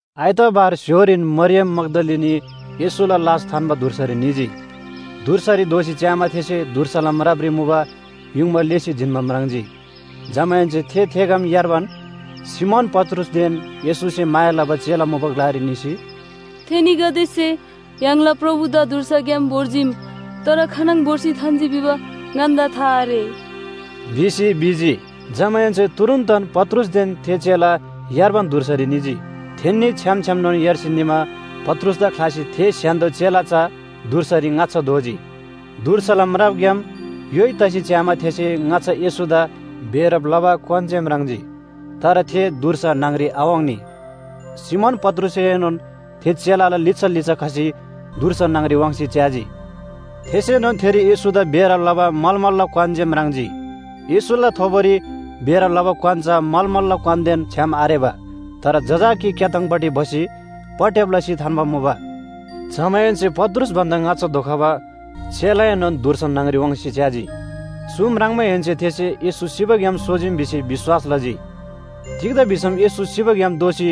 आइतवार स्‍य्‍होरीन मरियम मग्‍दलिनी येशूला लास थान्‍बा धुर्सारी निजी। धुर्सारी धोसी च्‍यामा थेसे धुर्साला म्रापरी मुबा युङबा लेःसी जिन्‍बा म्राङ्जी। जमाहेन्‍से थे थेग्‍याम यार्बान सिमोन पत्रुसदेन येशूसे माया लबा चेला मुबा ग्‍लारी निसी, “थेनीगदेसे य्‍हाङला प्रभुदा धुर्साग्‍याम भोर्जीम! तर खानङ भोर्सी थान्‍जी भिबा ङन्‍दा था आरे” भिसी भिजी। जमाहेन्‍से तुरुन्‍तन पत्रुसदेन थे चेला यार्बान धुर्सारी निजी। थेन्‍नी छ्‌याम छ्‌यामनोन यार्सी निमा पत्रुसदा ख्‍लासी थे स्‍य्‍हान्‍दो चेला चा धुर्सारी ङाच्‍छा धोजी। धुर्साला म्रापग्‍याम योइ तसी च्‍यामा थेसे ङाच्‍छा येशूदा बेरब लबा क्‍वान जे म्राङ्जी, तर थे धुर्सा न्‍हङ‍री आवाङ्नी। सिमोन पत्रुसएनोन थे चेलाला लिच्‍छा लिच्‍छा खसी धुर्सा न्‍हङ‍री वाङ्सी च्‍याजी। थेसेनोन थेरी येशूदा बेरब लबा मलमलला क्‍वान जे म्राङ्जी। येशूला थोबोरी बेरब लबा क्‍वान चा मलमलला क्‍वानदेन छ्‌याम आरेबा। तर जजाकी क्‍याथाङपट्टि भसी पटट्‍याब लसी थान्‍बा मुबा। जमाहेन्‍से पत्रुस भन्‍दा ङाच्‍छा धोखबा चेलाएनोन धुर्सा न्‍हङ‍री वाङ्सी च्‍याजी। चु म्राङ्माहेन्‍से थेसे येशू सिबाग्‍याम सोजीम भिसी विश्‍वास लजी। तिग्‍दा भिसम येशू सिबाग्‍याम दोःसी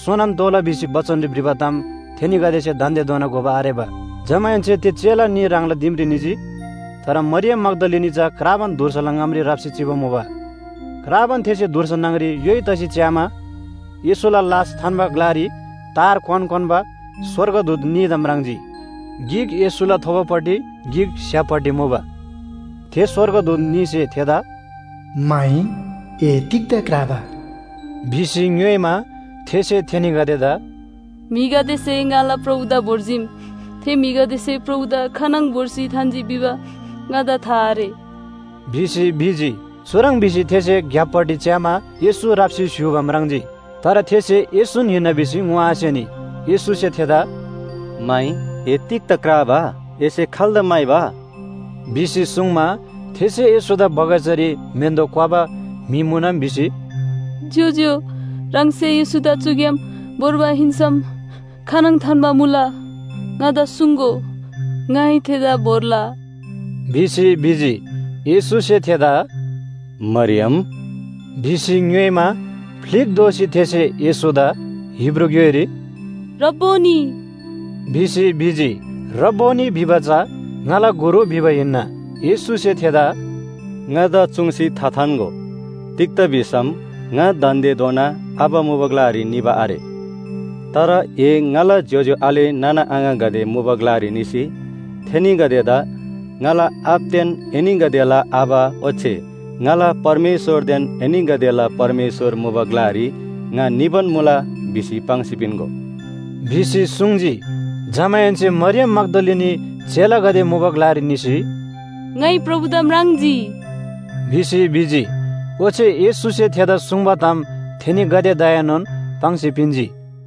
सोनोन तोःला भिसी बचनरी भ्रिबा ताम थेनीगदेसे दान्‍देधोना घोबा आरेबा। जमाहेन्‍से थे चेला न्‍ही ह्राङला दिमरी निजी। तर मरियम मग्‍दलिनी चा क्राबान धुर्साला ङामरी राप्‍सी चिबा मुबा। क्राबान थेसे धुर्सा न्‍हङ‍री योइ तसी च्‍यामा, येशूला लास थान्‍बा ग्‍लारी तार क्‍वान क्‍वान्‍बा स्‍वर्गदूत न्‍हीदा म्राङ्जी, गिक येशूला थोबोपट्टि गिक स्‍य्‍हापपट्टि मुबा। थे स्‍वर्गदूत न्‍हीसे थेदा “माइ, ए तिग्‍दा क्राबा?” भिसी ङ्‌योइमा, थेसे थेनीगदेदा “म्‍हिगदेसे ङाला प्रभुदा भोर्जीम, थे म्‍हिगदेसे प्रभुदा खानङ भोर्सी थान्‍जी भिबा ङादा था आरे” भिसी भिजी। चुह्रङ् भिसी थेसे ग्‍याप्‍पट्टि च्‍यामा येशू राप्‍सी स्‍य्‍हूबा म्राङ्जी। तर थेसे येशून हिन्‍ना भिसी ङोआसेनी। येशूसे थेदा “माइ, ए तिग्‍दा क्राबा? एसे खाल्‍दा म्‍हाइबा?” भिसी सुङ्मा, थेसे येशूदा बगैँचारी म्‍हेन्‍दो क्‍वबा म्‍हि मुनम भिसी, “ज्‍योज्‍यो, ह्राङसे येशूदा चुग्‍याम भोर्बा हिन्‍सम खानङ थान्‍बा मुला ङादा सुङ्‍गो, ङाइ थेदा भोर्ला” भिसी भिजी। येशूसे थेदा “मरियम!” भिसी ङ्‌योइमा, फ्‍लिक दोःसी थेसे येशूदा, हिब्रू ग्‍योइरी “रब्‍बोनी” भिसी भिजी। “रब्‍बोनी” भिबा चा “ङाला गुरु” भिबा हिन्‍ना। येशूसे थेदा “ङादा चुङ्सी थाथान्‍गो, तिग्‍दा भिसम ङा दान्‍देधोना आबा मुबा ग्‍लारी निबा आरे। तर ए ङाला ज्‍योज्‍यो आले नाना आङागदे मुबा ग्‍लारी निसी थेनीगदेदा ‘ङाला आबादेन एनीगदेला आबा ओच्‍छे ङाला परमेश्‍वरदेन एनीगदेला परमेश्‍वर मुबा ग्‍लारी ङा निबान मुला’ भिसी पाङ्सी पिन्‍गो” भिसी सुङ्जी। जमाहेन्‍से मरियम मग्‍दलिनी चेलागदे मुबा ग्‍लारी निसी, “ङाइ प्रभुदा म्राङ्जी” भिसी भिजी। ओच्‍छे येशूसे थेदा सुङ्बा ताम थेनीगदेदाएनोन पाङ्सी पिन्‍जी।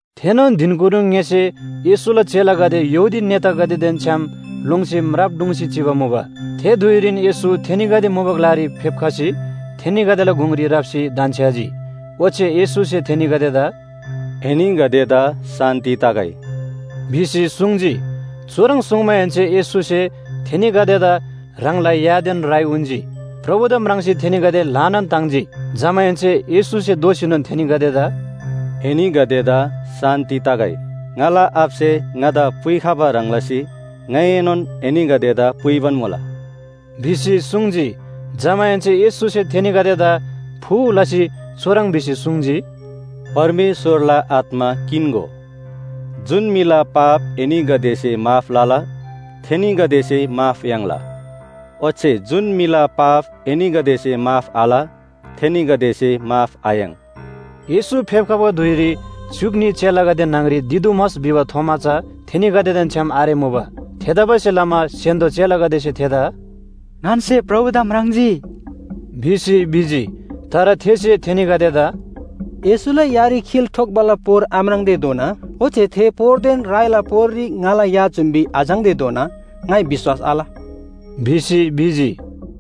थेनोन धिनकुनु ङ्‍यसे येशूला चेलागदे यहूदी नेतागदेदेन छ्‌याम लोङ्सी म्राप ढुङ्सी चिबा मुबा। थे धुइरीन येशू थेनीगदे मुबा ग्‍लारी फेप्‍खसी थेनीगदेला गुङरी राप्‍सी धन्‍छ्‌याजी। ओच्‍छे येशूसे थेनीगदेदा “एनीगदेदा शान्‍ति तगै” भिसी सुङ्जी। चुह्रङ् सुङ्माहेन्‍से येशूसे थेनीगदेदा ह्राङला यादेन राइ उन्‍जी। प्रभुदा म्राङ्सी थेनीगदे ल्‍हानान ताङ्जी। जमाहेन्‍से येशूसे दोःसीनोन थेनीगदेदा “एनीगदेदा शान्‍ति तगै! ङाला आबासे ङादा पुइखबा ह्रङ् लसी ङाइएनोन एनीगदेदा पुइबान मुला” भिसी सुङ्जी। जमाहेन्‍से येशूसे थेनीगदेदा फू लसी चुह्रङ् भिसी सुङ्जी, “परमेश्‍वरला आत्‍मा किन्‍गो। जुन म्‍हिला पाप एनीगदेसे माफ लला, थेनीगदेसे माफ याङ्ला, ओच्‍छे जुन म्‍हिला पाप एनीगदेसे माफ आल, थेनीगदेसे माफ आयाङ्।” येशू फेप्‍खबा धुइरी च्‍युक न्‍ही चेलागदे न्‍हङ‍री दिदुमस भिबा थोमा चा थेनीगदेदेन छ्‌याम आरेमुबा। थेतबासेलमा स्‍य्‍हान्‍दो चेलागदेसे थेदा “ङन्‍से प्रभुदा म्राङ्जी” भिसी भिजी। तर थेसे थेनीगदेदा “येशूला यारी खिल ठोक्‍बाला पोर आम्राङ्तेधोना, ओच्‍छे थे पोरदेन राइला पोररी ङाला या जुम्‍बी आझाङ्तेधोना ङाइ विश्‍वास आल” भिसी भिजी।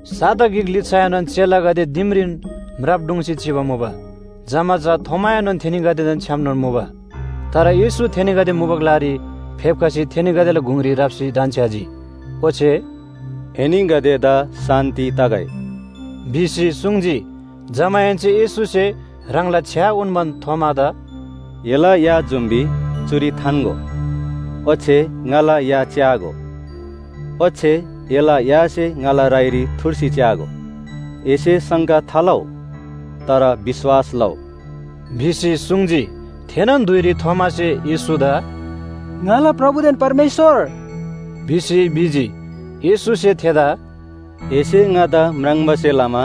साता गिक लिच्‍छाएनोन चेलागदे दिमरीन म्राप ढुङ्सी चिबा मुबा। जमा चा थोमाएनोन थेनीगदेदेन छ्‌यामनोन मुबा। तर येशू थेनीगदे मुबा ग्‍लारी फेप्‍खसी थेनीगदेला गुङरी राप्‍सी धन्‍छ्‌याजी, ओच्‍छे “एनीगदेदा शान्‍ति तगै!” भिसी सुङ्जी। जमाहेन्‍से येशूसे ह्राङला छ्‌या उन्‍बान थोमादा “एला या जुम्‍बी चुरी थान्‍गो, ओच्‍छे ङाला या च्‍यागो। ओच्‍छे एला यासे ङाला राइरी थुर्सी च्‍यागो। एसे शङ्का थालउ, तर विश्‍वास लउ” भिसी सुङ्जी। थेनोन धुइरी थोमासे येशूदा “ङाला प्रभुदेन परमेश्‍वर!” भिसी भिजी। येशूसे थेदा “एसे ङादा म्राङ्बासे लमा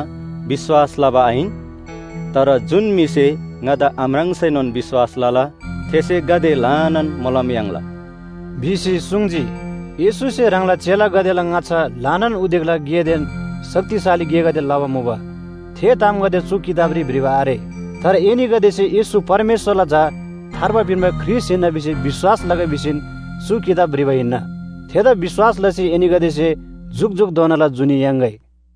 विश्‍वास लबा आहिन? तर जुन म्‍हिसे ङादा आम्राङ्सैनोन विश्‍वास लला, थेसे गाते ल्‍हानान मोलम याङ्ला” भिसी सुङ्जी। येशूसे ह्राङला चेलागदेला ङाच्‍छा ल्‍हानान उदेकला गेदेन शक्तिशाली गेगदे लबा मुबा, थे तामगदे चु किताबरी भ्रिबा आरे। तर एनीगदेसे येशू परमेश्‍वरला झा थार्बा पिन्‍बा ख्रीष्‍ट हिन्‍ना भिसी विश्‍वास लगै भिसीन चु किताब भ्रिबा हिन्‍ना। थेदा विश्‍वास लसी एनीगदेसे जुकजुकधोनाला जुनी याङ्‌गै।